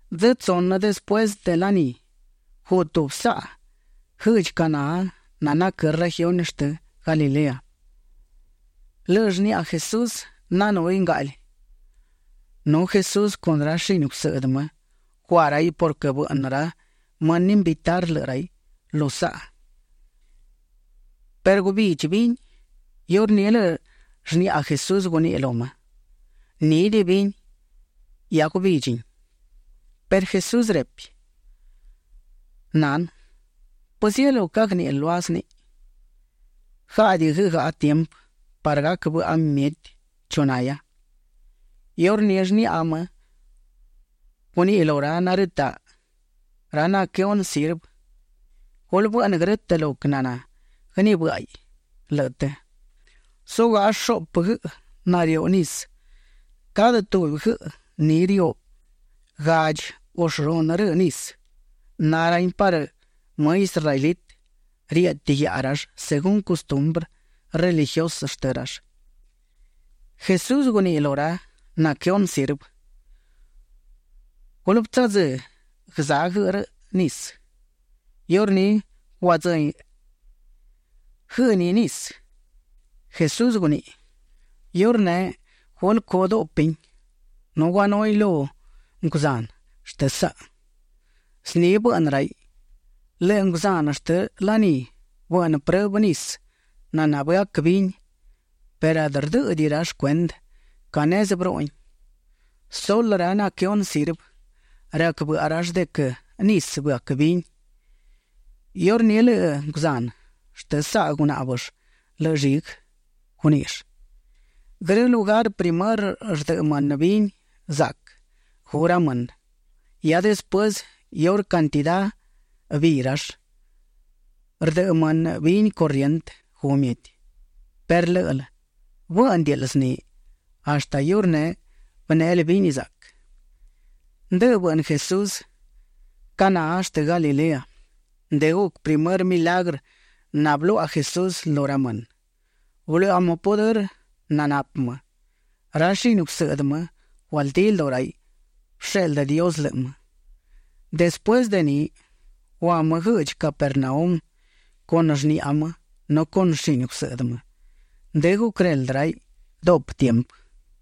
Dzë tsunë despuësë de ni, guꞌ tubi saꞌa guëꞌdchi Caná nanaquë́ regiuni shtë Galilea. Lëꞌë shniꞌa Jesús nanúhiꞌ ngaꞌli. Nu Jesús con ra shini gusëꞌdë më gua raiꞌ purquë bëꞌnë ra mënë invitar lëꞌë raiꞌ lu saꞌa perë gubidchi vini. Iurní lëꞌë shniꞌa Jesús guníꞌiꞌ lu më: ―Nídiꞌi vini. Hia gubidchin. Perë Jesús repi: ―Nanë, ¿pëzielú cagníꞌil lua zniꞌi? Gáꞌadiꞌi guëgaꞌa tiempë parë gac bëꞌa mieti chu nahia. Iurní shniꞌa më guniꞌi lu narëtaꞌ, ra naquëhunë sirvë: ―Gulë bëꞌnë grë́tëꞌ lo quë naná guënibë́ꞌaiꞌ lëꞌë të. Zugaꞌa shuꞌpë guëꞌë nariú nisë, cadë tubi guëꞌë ni riú gadchi u shunë rëëꞌ nisë. Na rahin parë më israelitë; rieꞌti guiaꞌa rall según custumbrë religiusë shtë rall. Jesús guniꞌi lu ra naquëhunë sirvë: ―Gulë bëtsadzë́ guëzá guëꞌë rëꞌ nisë. Iurní guadzëhin guëꞌë ni nisë; Jesús guniꞌi: ―Iurneꞌ gulë cu duꞌpin nu guanuhin lu nguzanë shtë saꞌa. Zni bëꞌnë raiꞌ. Lëꞌë nguzanë shtë laní bëꞌnë prëbë nisë naná bëac vini perë adë rdë́ꞌëdiꞌill cuendë ca nezë bërúꞌuhin. (Sulë ra naquëhunë sirvë, rac bëꞌa rall de quë nisë bëac vini). Iurní lëꞌë nguzanë shtë saꞌa gunáꞌbëll lëꞌë lliguë. Guníꞌill: ―Grë lugar primërë rdëꞌë mënë vini zaꞌquë gu ra mënë. Hia despuësë iurë cantidá biiꞌ rall, rdëꞌë mënë vini corrientë gu mieti, perë lë́ꞌël bë́ꞌnëdiꞌil zni. Hashtë iurneꞌ bënéꞌel vini zaꞌquë. Ndëꞌë bëꞌnë Jesús Caná shtë Galilea. Ndë guc primërë milagrë nabëluaꞌa Jesús lu ra mënë. Bëluaꞌa më pudërë nanapë më. Ra shini gusëꞌdë më gualdí lduꞌu raiꞌ bësheꞌldë Dios lëꞌë më. Despuësë de ni, gua më guëꞌdchi Capernaum con shniꞌa më nu con shini gusëꞌdë më. Ndë guquëreldë raiꞌ duꞌpë tiempë.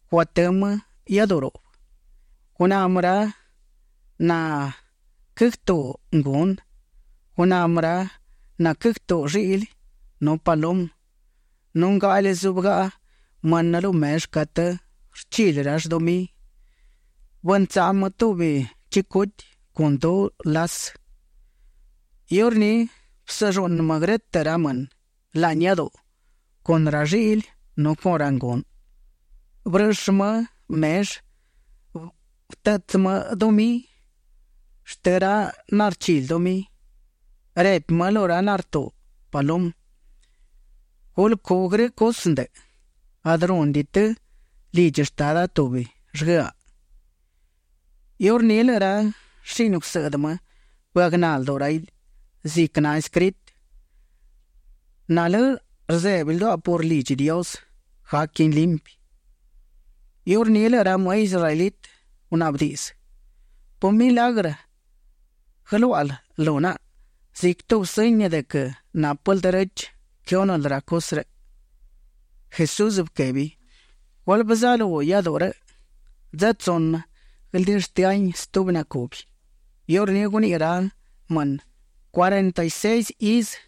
Guatë́ më iáduꞌu ruꞌbë. Guná më ra naquëgtuuꞌ ngunë. Guná më ra naquëgtuuꞌ lliꞌli nu palumë. Nu ngaꞌli zúbëgaꞌa mënë lu mellë catë rchili rall dumí. Bëntsaꞌu më tubi chicuti con du lasë. Iurní bësëlluꞌnë më grë́tëꞌ ra mënë laꞌni iáduꞌu con ra lliꞌli nu con ra ngunë. Bërëꞌshë më mellë. Bërëꞌtsë dumí shtë ra narchili dumí. Repi më lu ra nartuuꞌ palumë: ―Gulë cu grë cusë ndëꞌë. Adë rúnëdiꞌi të lidchi Shtada tubi llguëaꞌ. Iurní lëꞌë ra shini gusëꞌdë më bëagná lduꞌu raiꞌ ziquë naescritë: “Nalë́ rzebi lduaꞌa por lidchi Dios; gaquin limpi”. Iurní lëꞌë ra më israelitë gunaꞌbë diꞌdzë: ―¿Pë milagrë guëluáꞌal lu naꞌa ziquë tubi sëñi de quë nápël derechë quëhúnël ra cusë rëꞌ? Jesús bëquebi: ―Gulë bëzalú iáduꞌu rëꞌ; dzë tsunë guëldishtë́ahin stubi nacubi. Iurní guniꞌi ra mënë: ―Cuarenta y seis izë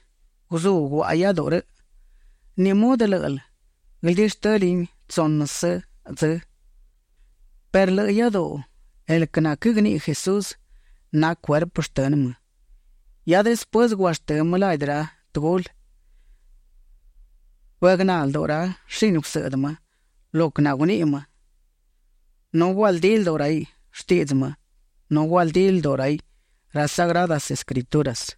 guzú guaꞌa iáduꞌu rëꞌ. ¿Ni mudë lë́ꞌël guëdishtëlin tsúnësë dzë? Perë lëꞌë iáduꞌu, el quë naquëgniꞌi Jesús, na cuerpë shtënë më. Hia despuësë guashtë́ më ladi ra tëgulë, bëagná lduꞌu ra shini gusëꞌdë më lo quë naguniꞌi më, nu gualdí lduꞌu raiꞌ shtiꞌdzë më, nu gualdí lduꞌu raiꞌ ra Sagradas Escrituras.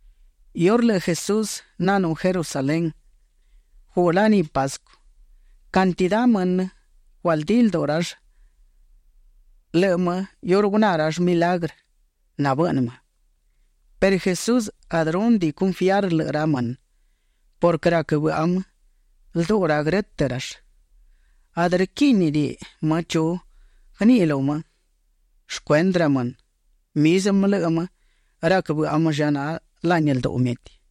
Iurë lëꞌë Jesús nanú Jerusalén, guꞌ laní Pascu. Cantidá mënë gualdí lduꞌu rall lëꞌë më iurë guná rall milagrë nabëꞌnë më. Perë Jesús adë rúnëdiꞌi confiar lëꞌë ra mënë purquë rac bëꞌa më lduꞌu ra grë́tëꞌ rall. Adë rquíꞌnidiꞌi më chu guëniꞌi lu më shcuendë ra mënë. Mizmë lëꞌë më rac bëꞌa më lla na laꞌni lduꞌu mieti.